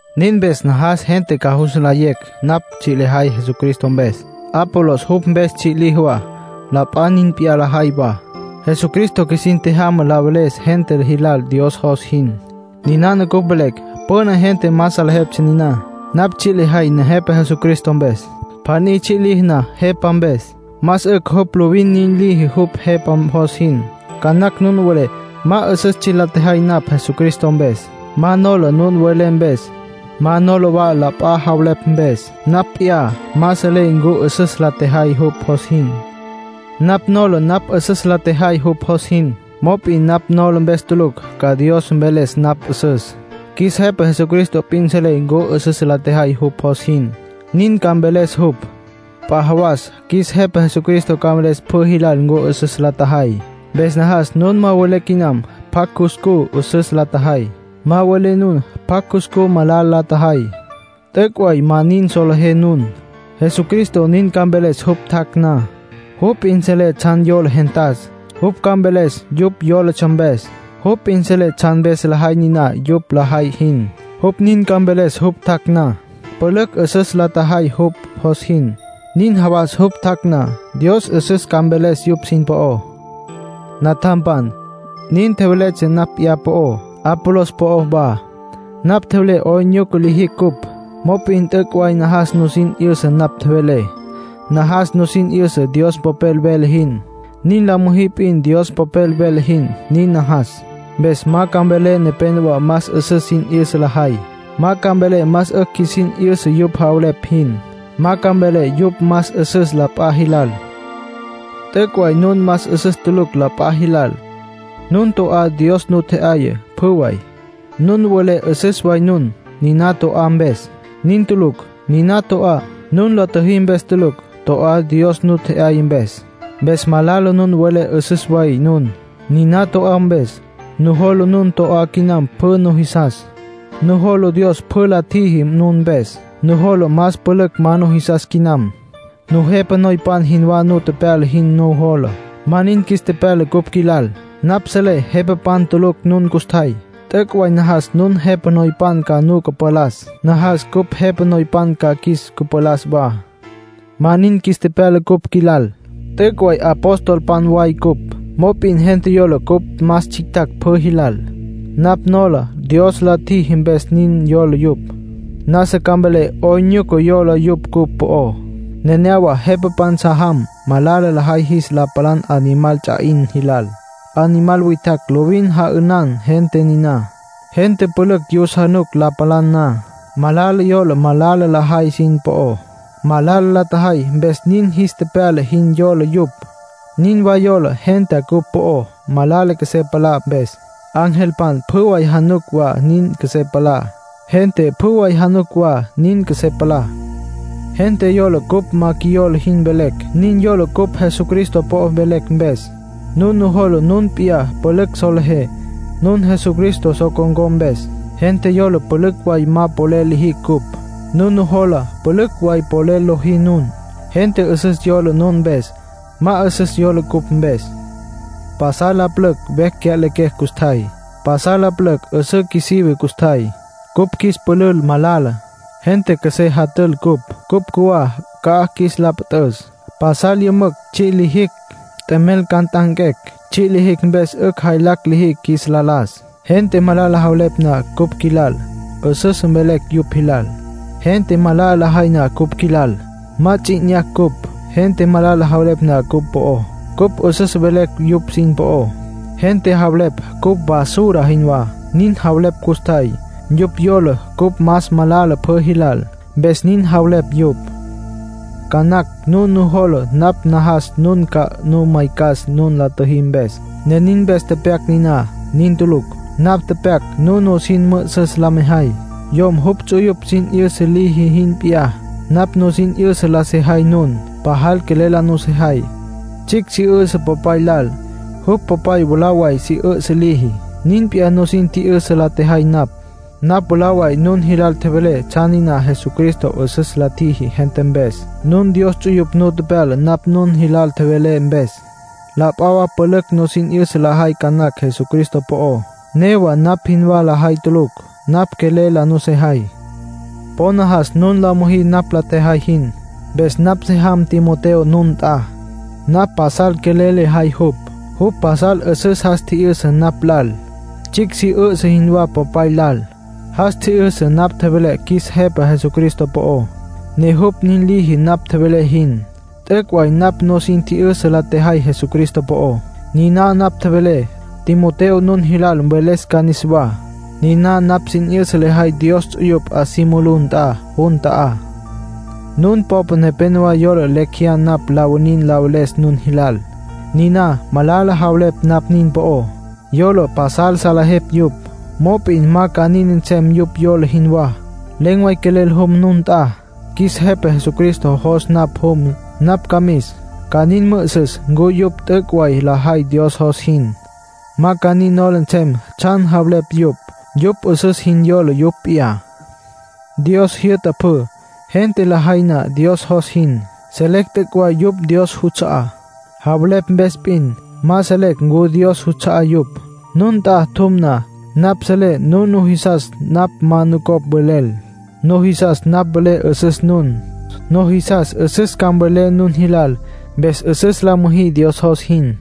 Nin mpes najas gente ca jus nlayecj napj tsji' lejay Jesucristo mpes. Apolos jupj mpes tsji' liji wa. La p'a nin p'iyá lajay wa. Jesucristo qjuisin tjejyama la veles gente jilal Dios jos jin. Ninana cupj velecj, püna gente ma salejeptsja niná. Napj tsji' lejay Nejepa Jesucristo mpes. Pjaní tsji' liji na jepa mpes, más 'ücj jupj lovin nin liji jupj jepa jos jin. Ca nacj nun welé ma 'üsüs tsji' la tjejay napj Jesucristo mpes. Ma nola nun welé mpes. Ma nola wa la p'a javelepj mpes. Napj p'iyá ma selé ncu 'üsüs la tjejay jupj jos jin. Napj nola napj 'üsüs la tjejay jupj jos jin. Mop'in napj nola mpes tulucj ca Dios mveles napj 'üsüs. Qjuis Jepa Jesucristo p'in selé ncu 'üsüs la tjejay jupj jos jin. Nin ca mveles jupj. P'a jawas qjuis Jepa Jesucristo ca mveles pjü jilal ncu 'üsüs la tjajay. Mpes najas nun ma welé quinam pjacj cuscú 'üsüs la tjajay. Ma mvelé nun pjacj cuscú malala la tjajay. T'üc' way ma nin solejé nun. Jesucristo nin ca mveles jupj tjac' na. Jupj p'in selé tsjan yola gentas. Jupj ca mveles yupj yólatsja mpes. Jupj p'in selé tsjan mpes lajay niná yupj lajay jin. Jupj nin ca mveles jupj tjac' na. Pülücj 'üsüs la tjajay jupj jos jin. Nin jawas jupj tjac' na, Dios 'üsüs ca mveles yupj sin po'ó. Natjampan, nin tjeveletsja napj p'iyá po'ó, Apolos po'ó wa. Napj tjevelé 'oyn nyuca lijicj cupj. Mop'in t'üc' way najas nusin 'yüsa napj tjevelé. Najas nusin 'yüsa Dios Popel vele jin; nin la müjí p'in Dios Popel vele jin, nin najas. Mpes ma ca mvelé nepénowa más 'üsüs sin 'yüsa lajay. Ma ca mvelé más 'ücj qjuisin 'yüsa yupj javelepj jin. Ma ca mvelé yupj más 'üsüs la p'a jilal. T'üc' way nun más 'üsüs tulucj la p'a jilal. Nun to'á, Dios nu tje'yaya, pjü way. Nun welé 'üsüs way nun, niná to'á mpes. Nin tulucj. Niná to'á, nun la tjüjí mpes tulucj. To'á Dios nu tje'yaya mpes. Mpes malala nun welé 'üsüs way nun, niná to'á mpes. Nujola nun to'á quinam pjü nujisas. Nujola Dios pjü la tjiji nun mpes, nujola más pülücj ma nujisas quinam. Nun jepa noypan jinwá nu tepyala jin nujola. Ma nin qjuis tepyala cupj qjuilal. Napj selé jepapan tulucj nun custjay. T'üc' way najas nun jepa noypan ca nu cüpalas. Najas cupj jepa noypan ca qjuis cüpalas wa. Ma nin qjuis tepyala cupj qjuilal. T'üc' way apostolpan way cupj; mop'in gente yola cupj más tsjictjacj pjü jilal. Napj nola Dios la tjiji mpes nin yola yupj. Nasa ca mvelé 'oyn nyuca yola yupj cupj po'ó. Nenéyawa jepapan sa jam malala lajay jis la palan animal ts'a 'in jilal. Animal witjacj lovin ja'ünan gente niná. Gente pülücj yus januc la palan na. Malala yola malala lajay sin po'ó; malala la tjajay mpes nin jis tepyala jin yola yupj. Nin wa yola gentá cupj po'ó, malala qjuesé palá mpes. Angelpan pjü way januc wa nin qjuesé palá. Gente pjü way januc wa nin qjuesé palá. Gente yola cupj ma qjuiyola jin velecj. Nin yola cupj Jesucristo po'o velecj mpes. Nun nujola nun p'iyá pülücj solejé, nun Jesucristo so con̈có mpes. Gente yola pülücj way ma polel lijicj cupj. Nun nujola pülücj way polel lojí nun. Gente 'üsüs yola nun mpes; ma 'üsüs yola cupj mpes. Pasal la pülücj vecj cya'lequecj custjay. Pasal la pülücj 'üsǘ qjuisive custjay. Cupj qjuis pülül malala. Gente qjuesé jatül cupj. Cupj cjuwá ca'aj qjuis la püt'üs. Pasal yümücj tsji' lijicj, t'emel ca nt'anquecj. Tsji' lijicj mpes 'ücj jaylacj lijicj qjuis la las. Gente malala javelepj na cupj qjuilal, 'üsüs velecj yupj jilal. Gente malala lajay na cupj qjuilal, ma ts'i 'inyacj cupj. Gente malala javelepj na cupj po'ó, cupj 'üsüs velecj yupj sin po'ó. Gente javelepj cupj basura jinwá. Nin javelepj custjay. Yupj yola cupj más malala pjü jilal, mpes nin javelepj yupj. Ca nacj nun nujola napj najas nun ca nu maycas nun la tjüjí mpes, ne nin mpes tepyac niná. Nin tulucj. Napj tepyac nun nusin mü'üsüs la mejay. Yom jupj ts'uyupj sin 'yüsa liji jin p'iyá, napj nusin 'yüsa la sejay nun. Pajal quelel la nusejay. Tsjicj si 'üsǘ popay lal. Jupj popay mwalá way si 'üsǘ liji. Nin p'iyá nusin tji'yüsa la tjejay napj. Napj mwalá way nun jilal tjevelé tsjan niná Jesucristo 'üsüs la tjiji gente mpes. Nun Dios ts'uyupj nu tepyala napj nun jilal tjevelé mpes. La p'a wa pülücj nusin 'yüsa lajay ca nacj Jesucristo po'ó, newa napj jinwá lajay tulucj. Napj quelel la nusejay. Po najas nun la müjí napj la tjejay jin. Mpes napj se jam Timoteo nun nt'a. Napj pasal quelel lejay jupj. Jupj pasal 'üsüs jas tji'yüsa napj lal, tsjicj si 'üsǘ jinwá popay lal. Jas tji'yüsa napj tjevelé qjuis Jepa Jesucristo po'ó, ne jupj nin liji napj tjevelé jin. T'üc' way napj nusin tji'yüsa la tjejay Jesucristo po'ó. Niná napj tjevelé, Timoteo nun jilal mveles ca niswá. Niná napj sin 'yüsa lejay Dios ts'uyupj 'a si mulú nt'a jun ta'á. Nun popa nepénowa yola lecj jeyá napj la winin la veles nun jilal. Niná malala javeleptsja napj nin po'ó. Yola pasal salejepj yupj. Mop'in ma ca nin nsem yupj yola jinwá. Len̈ way quelel jum nun nt'a. Qjuis Jepa Jesucristo jos napj jum, napj ca mis. Ca nin mü'üsüs ncu yupj t'üc' way lajay Dios jos jin. Ma ca nin nola nsem tsjan javelepj yupj. Yupj 'üsüs jin yola yupj p'iyá. Dios jyü'ta pjü. Gente lajay na Dios jos jin, selecj t'üc' way yupj Dios juts'a'á. Javelepj mpes p'in, ma selecj ncu Dios juts'a'á yupj. Nun nt'a tjum na, napj selé nun nujisas napj ma nucopj mvelel. Nujisas napj velé 'üsüs nun. Nujisas 'üsüs ca mvelé nun jilal. Mpes 'üsüs la müjí Dios jos jin.